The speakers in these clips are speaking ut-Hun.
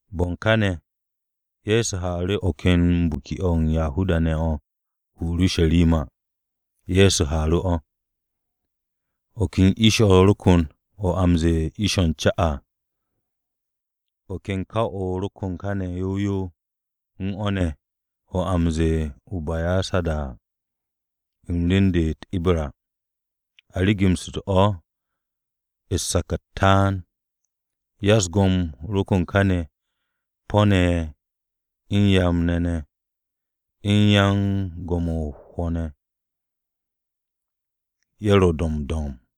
Bo̱ u̱n káne̱, Ye̱so haaru̱ o̱ ken biki-o̱ u̱n Yahuda-ne̱ o̱ o-Urusharima. Ye̱so haaru̱ o̱. O̱ ken ish-o̱ ro kon o̱ a m-ze̱e̱ Ish-o̱ u̱n Ca à. O̱ ken kaw-o̱ ro̱ ko̱n kane̱ yow yow u̱n o̱ ne̱ a o̱ m-ze̱e̱ o-Basayada à, u̱n rem-de u̱n u̱t-Ibra. A rigimshite̱ o̱ u̱n sak-u̱t taan. Ya-u̱s-go̱m ro kon káne̱ po̱-ne̱, u̱n ryam-ne̱ ne̱, u̱n yan go̱m-o̱ u̱s-hwo̱ ne̱. Ye̱ ro̱ do̱mb do̱mb.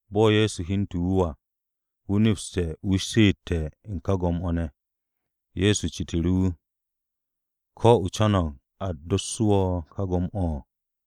Bo̱ Ye̱so hyente̱ wu̱ à, wu̱ nepste̱ wu̱ she'ete̱ u̱n ka go̱m-o̱ ne̱. Ye̱so citu̱ru̱ wu̱, “¿Ko̱ o co̱no̱g a dossu̱ wo̱ ka go̱m-o̱?”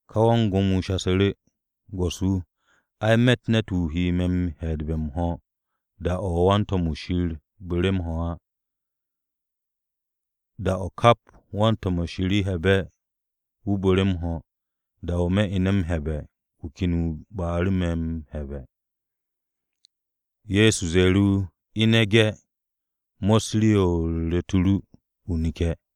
Ka wan-go̱m wu̱ shasu̱ru̱, “Go̱s-wu̱, ai, me̱tt ne̱t-wu̱ he me̱ m-he̱'e̱dbe̱ m-ho̱, da-o̱ wan-to̱m-wu̱ Shir bu̱re̱ mo̱ á. Da-o̱ kap wan-to̱m-wu̱ Shir he̱'e̱be̱, wu̱ bu̱re̱ m-ho̱, da-o̱ me̱ ine̱ m-he̱'e̱be̱, wu̱ ken ba'u̱ru̱ me̱ m-he̱'e̱be̱.” Ye̱so ze̱e̱ru̱ wu̱, “Ine̱ ge̱! Mos rii-o̱ u̱r-ru̱t o̱ ru, o neke̱.”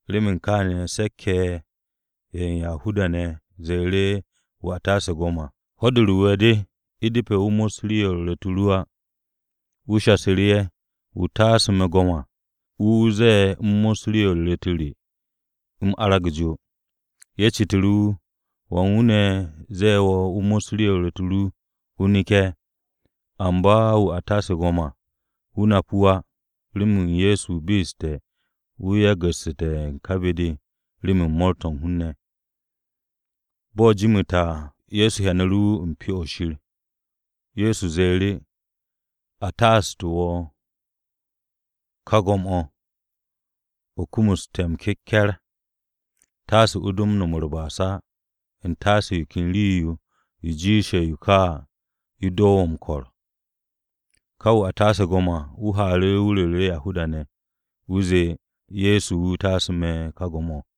Remen kááne̱, se̱k-ye̱ ye̱ u̱n Yahuda-ne̱ ze̱e̱ru̱ wu̱ a taase̱ go̱m à, “Ho̱-de u̱r-Wu̱we̱ de. U̱depe̱ o mos rii-o̱ u̱r-ru̱t o̱ ru á.” Wu̱ shasu̱ru̱ ye̱, “Wu̱ taasu̱ me̱ go̱m à, wu̱ wu̱ ze̱e̱ u̱m mos rii-o̱ u̱r-ru̱t o̱ re, u̱m arag jo.” Ye̱ citu̱ru̱ wu̱, “¿Wan wu̱ ne̱ ze̱e̱ wo̱ o mos rii-o̱ u̱r-ru̱t o ru, o neke̱?” Amba wu̱ a taase̱ ka go̱m-o̱ à, wu̱ nap wu̱ á, remen Ye̱so be'essu̱te̱ wu̱ yagu̱su̱te̱ ka be-de remen mo̱o̱r-to̱ u̱n hun-ne̱. Bo̱ jimite̱ à, Ye̱so hyanu̱ru̱ wu̱ u̱n Pyo-o̱ Shir. Ye̱so ze̱e̱ru̱, “A taasu̱tu̱ wo̱ ka go̱m-o̱, o kumuste̱ m-keke̱r. Taase o do no̱m u̱r-ba'as á, u̱ntaase yo ken rii-yo yo jiishe̱ yo ka à yo do wo̱ m-ko̱r.” Ka wu̱ a taase̱ go̱m à, wu̱ haaru̱, wu̱ ru̱ru̱ Yahuda-ne̱. Wu̱ zee Ye̱so wu̱ taasu̱ wu̱ ka go̱m-o̱.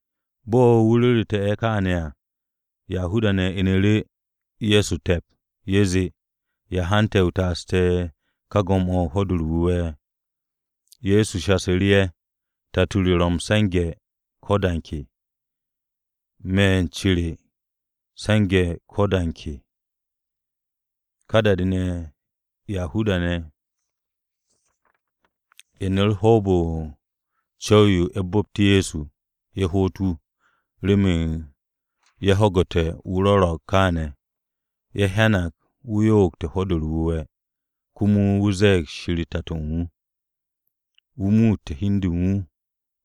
Bo̱ wu̱ ru̱ru̱te̱ ye̱ kááne̱ à, Yahuda-ne̱ inu̱ru̱ Ye̱so te̱p, ye̱ zee, “¿Ya hante̱ o taasu̱te̱ wu̱ ka go̱m-o̱ u̱n Ho̱-de u̱r-Wu̱we̱?” Ye̱so shasu̱ru̱ ye̱, “Tato re ro̱ m-se̱nge̱ ko̱ da u̱n ke. Me̱ u̱n ce re me̱ m-se̱nge̱ ko̱ da u̱n ke.” Ka da-de ne̱, Yahuda-ne̱ inu̱ru̱ hoob-o̱ u̱n co̱w-yo ye̱ bu̱pt Ye̱so, ye̱ hoot wu̱, remen ye̱ ho̱gu̱te̱ wu̱ rwo̱ro̱g kááne̱, ye̱ hyanag wu̱ yo'ogte̱ Ho̱-de u̱r-Wu̱we̱. Komo wu̱ ze̱e̱g Shir Tato u̱n wu̱. Wu̱ muutte̱ hi u̱n de u̱n wu̱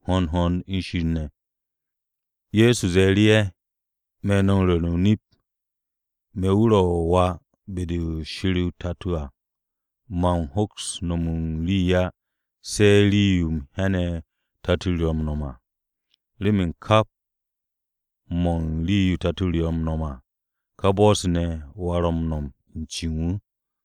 hond hond u̱n Shir ne̱. Ye̱so ze̱e̱ru̱ ye̱, “Me̱ no̱ m-ru̱re̱ o-nip, me̱ wu̱ ro̱ Wà be-de Shir o-Tato à, man hoks no̱m u̱n rii á, se̱ rii-yo u̱m hyane̱ Tato-o ro̱ m-no̱m à. Remen kap mo̱ u̱n rii-yo Shir o-Tato ro̱ m-no̱m à, ka bo̱-se ne̱ Wà ro̱ m-no̱m u̱n ce u̱n wu̱.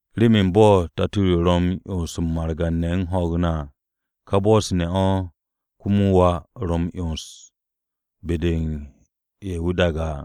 Remen bo̱ Tato-o ro̱ m-'yons u̱n margan-ne̱ u̱n ho̱o̱g ne̱ à, ka bo̱-se ne̱ o̱ komo Wà ro̱ m-'yons be-de u̱n ye̱ wu̱ daage̱ à.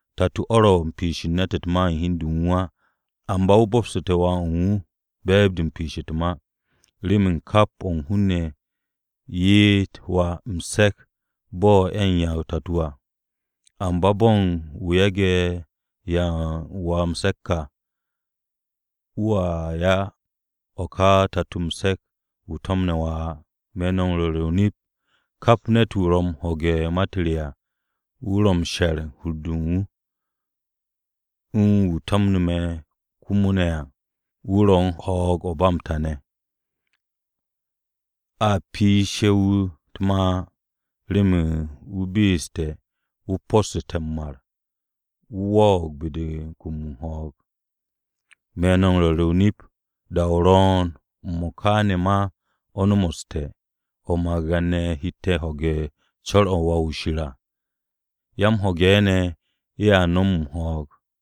Tato-o ro̱ u̱n piishe̱ u̱n ne̱t u̱t-ma u̱n hi u̱n de u̱n wu̱ á. Amba wu̱ bo̱bsu̱te̱ Wà u̱n wu̱ be̱e̱b-de u̱n piish u̱t-ma, remen kap o̱ u̱n hun-ne̱ ye'et Wà m-se̱k bo̱ a u̱n 'ya o-Tato à. Amba bo̱ u̱n wu̱ yage̱ 'ya u̱n Wà m-se̱k à wu̱ 'ya o̱ ka o-Tato m-se̱k wu̱ to̱mne̱ Wà á. Me̱ no̱ m-ru̱re̱ o-nip, kap ne̱t-wu̱ ro̱ m-ho̱ge̱ ma-u̱t re à, wu̱ ro̱ m-she̱r u̱n hur-de u̱n wu̱, u̱n wu̱ to̱mne̱ me̱ komo ne̱ à, wu̱ ro̱ u̱n ho̱o̱g-o̱ u̱n ba m-ta ne̱. A piishe̱ wu̱ u̱t-ma á, remen wu̱ be'essu̱te̱, wu̱ possu̱ssu̱te̱ m-mar, wu̱ wo̱o̱g be-de u̱n kum u̱n ho̱o̱g. “Me̱ no̱ m-ru̱re̱ o-nip, da-o ro̱o̱n, m-mo̱ka ne̱ ma o̱ nomoste̱, o̱ margan-ne̱ hette̱ ho̱ge̱ u̱n co̱r-o̱ u̱n Wà-wu̱ Shir à. Ya-m-ho̱ge̱ ne̱ ye̱a nom ho̱o̱g.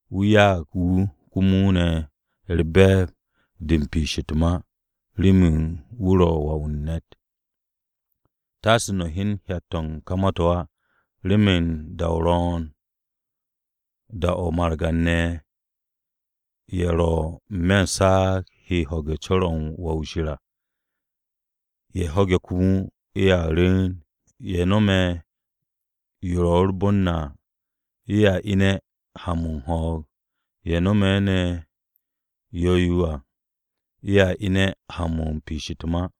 Wu̱ ya'ag wu̱ komo ne̱ u̱r-be̱e̱b de u̱n piish u̱t-ma, remen wu̱ ro̱ Wà-wu̱ u̱n ne̱t. “Taase no̱ hyen hyat-to̱ u̱n ka ma-to̱ á, remen da-o ro̱o̱n da-o̱ margan-ne̱ ye̱ ro̱ n-me̱ u̱s-saag he ho̱ge̱ u̱n co̱r-o̱ u̱n Wà-wu̱ Shir à. Ye̱ ho̱ge̱ komo, ye̱a rwu̱u̱n. Ye̱ no̱me̱ yo u̱r-bon à, ye̱a ine̱ ha-mo̱ u̱n ho̱o̱g. Ye̱ no̱me̱ ne̱ yo̱-o à, ye̱a ine̱ ha-mo̱ u̱n piish u̱t-ma.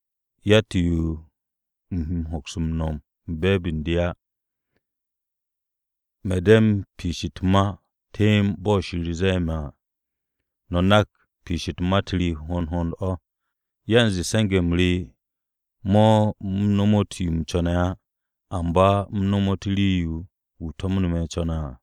Yatt-yo u̱m he hoks m-no̱m u̱n be̱e̱b u̱n de á. Me̱ de̱ m-piish u̱t-ma temb bo̱ Shir ze̱e̱ me̱ à. No̱ nak piish u̱n ma-u̱t re hond hond o̱, yanze se̱nge̱-m re mo̱ u̱m nomot yo u̱m co̱ne̱ á, amba u̱m nomot o̱ rii-yo wu̱ to̱mne̱ co̱ne̱ à.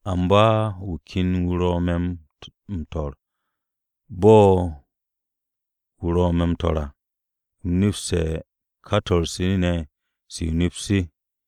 Amba wu̱ ken wu̱ ro̱ me̱ m-su̱'e̱. Bo̱ wu̱ ro̱ me̱ m-su̱'e̱ à, u̱m nepste̱ u̱n ka to̱r-se ne̱, se o-nip se.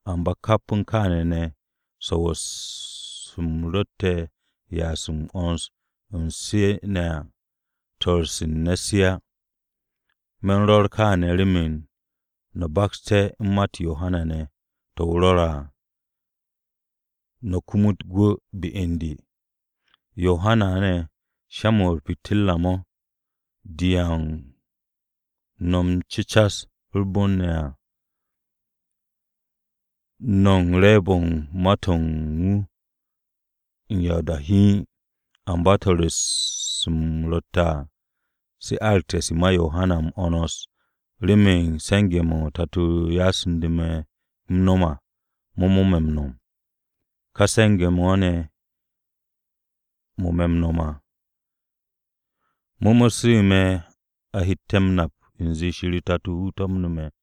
Amba kap u̱n kááne̱ ne̱, swo̱-se u̱m ro̱tte̱ m-ya'as m-'wo̱ns u̱n se ne̱ à, swo̱-se u̱n ne̱t se á. Me̱n rwo̱r kááne̱ remen no̱ bakste̱ u̱n ma-u̱t Yohana ne̱ to̱ wu̱ rwo̱re̱ à, no̱ kumut gwu̱ be u̱n de. Yohana ne̱ sha-mo̱ u̱r-pitirra mo̱, de u̱n 'ya u̱n no̱ m-cecas u̱r-bon ne̱ à. No̱ u̱n re̱e̱b-o̱ u̱n ma-to̱ u̱n wu̱ u̱n ya o-da hiin. “Amba swo̱-se u̱m ro̱tte̱ à, se aragte̱ se ma Yohana m-'wo̱ns remen se̱nge̱-mo̱ Tato-o ya'su̱nde̱ me̱ u̱m nom à, mo̱ mo̱ me̱ m-nom. Ká se̱nge̱-mo̱ ne̱ mo̱ me̱ m-no̱m à, mo̱ mo̱ su̱u̱ me̱ a hette̱ m-nap u̱nze Shir o-Tato wu̱ to̱mne̱ me̱.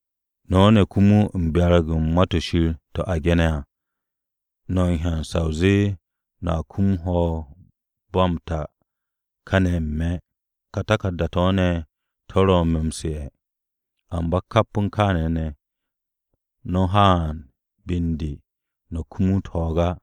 No̱ ne̱ komo u̱n m-byarag u̱n Ma-to̱ Shir to̱ a ge̱ne̱ à. No̱ m-hyan sa o zee no̱a kum ho̱o̱g-o̱ ba m-ta kane̱ n-me̱. Ka taku̱rda-to̱ ne̱ to̱ ro̱ me̱ m-su̱'e̱. Amba kap u̱n kaane̱ ne̱, no̱ haan be u̱n de, no̱ kumut ho̱o̱g á.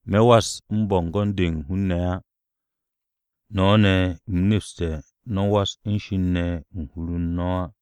“Me̱ was u̱n bo̱ngo̱n-de u̱n ko-hun-ne̱ á. No̱ ne̱, u̱m nepste̱ no̱ was u̱n Shir ne̱ u̱n hur-u̱r no̱ á.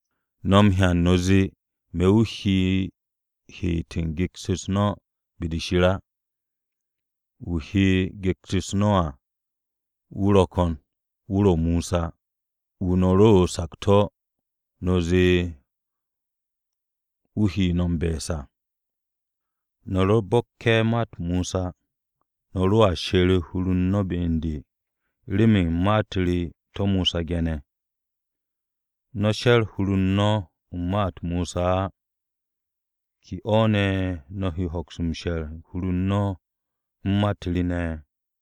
“No̱ hyan no̱ zee me̱ wu̱ he m-heet u̱n gyekt-u̱s no̱ be-de Shir á. Wu̱ he gyekt-u̱s no̱ à wu̱ ro̱ ko̱n, wu̱ ro̱ Mosa, wu̱ no̱ ro o-sakto̱ no̱ zee wu̱ he no̱ m-be̱e̱s à. No̱ ro bo̱kke̱ ma-u̱t Mosa, no̱ ro̱a she̱r hur-u̱r no̱ be u̱n de, remen ma-u̱t re to̱ Mosa ge̱ne̱. No̱ she̱r hur-u̱r no̱ u̱n ma-u̱t Mosa ne̱ á, ¿ke o̱ no̱ he hoks m-she̱r u̱n hur-u̱r no̱ u̱n ma-u̱t re ne̱?”